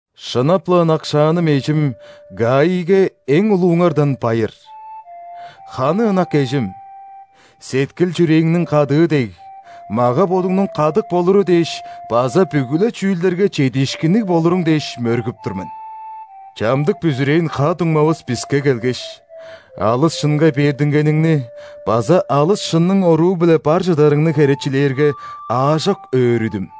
Шынап-ла ынакшааным эжим Гаийге эң улууңардан байыр. Ханы ынак эжим! Сеткил-чүрээңниң кадыы дег, мага-бодуңнуң кадык болуру дээш база бүгү-ле чүүлдерге чедиишкинниг болуруң дээш мөргүп тур мен. Чамдык бүзүрээн ха-дуңмавыс биске келгеш, алыс шынга бердингениңни база алыс шынның оруу-биле бар чыдарыңны херечилээрге, аажок өөрүдүм.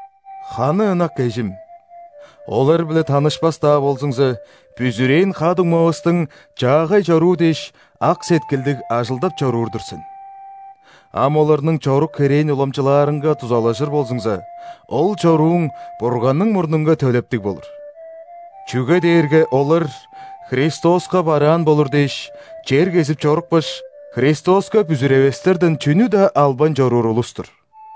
Ханы ынак эжим! Олар-биле танышпас-даа болзуңза, бүзүрээн ха-дуңмавыстың чаагай чоруу дээш ак сеткилдиг ажылдап чоруур-дур сен. Ам оларның чорук-херээн уламчылаарынга дузалажыр болзуңза, ол чорууң Бурганның мурнунга төлептиг болур. Чүге дээрге олар Христоска бараан болур дээш, чер кезип чорупкаш, Христоска бүзүревестерден чүнү-даа албайн чоруур улус-тур.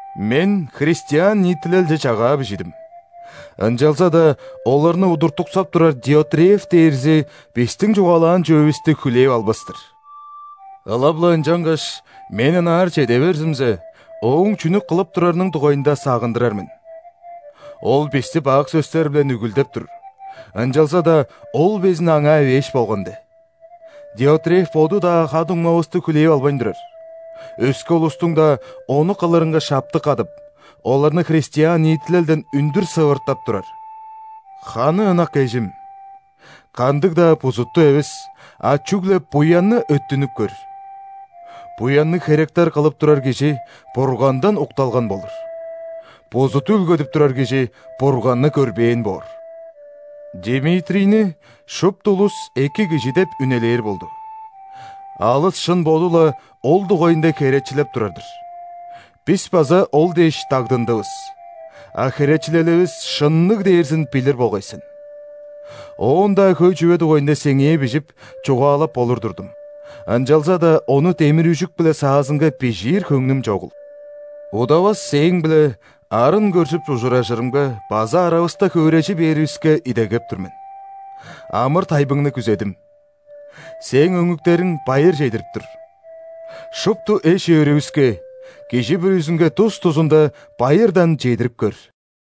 Мен христиан ниитилелче чагаа бижидим, ынчалза-даа оларны удуртуксап турар Диотреф дээрзи бистиң чугаалаан чүвевисти хүлээп албас-тыр. Ылап-ла ынчангаш, мен ынаар чеде берзимзе, ооң чүнү кылып турарының дугайында сагындырар мен. Ол бисти бак сөстер-биле нүгүлдеп тур, ынчалза-даа ол безин аңаа эвээш болган де. Диотреф боду-даа ха-дуңмавысты хүлээп албайн турар, өске улустуң-даа ону кылырынга шаптык кадып, оларны христиан ниитилелден үндүр сывыртап турар! Ханы ынак эжим! Кандыг-даа бузутту эвес, а чүгле буянны өттүнүп көр. Буянныг херектер кылып турар кижи Бургандан укталган болур. Бузут үүлгедип турар кижи Бурганны көрбээн боор. Димитрийни шупту улус эки кижи деп үнелээр болду, алыс шын боду-ла ол дугайында херечилеп турар-дыр; бис база ол дээш дагдындывыс, а херечилеливис шынныг дээрзин билир болгай сен. Оон-даа хөй чүве дугайында сеңээ бижип, чугаалап болур турдум, ынчалза-даа ону демир-үжүк-биле саазынга бижиир хөңнүм чогул. Удавас сээң-биле арын көржүп ужуражырымга база аравыста хөөрежи бээривиске идегеп тур мен. Амыр-тайбыңны күзедим. Сээң өңнүктериң байыр чедирип тур. Шупту эш-өөрүвүске, кижи бүрүзүнге тус-тузунда, байырдан чедирип көр.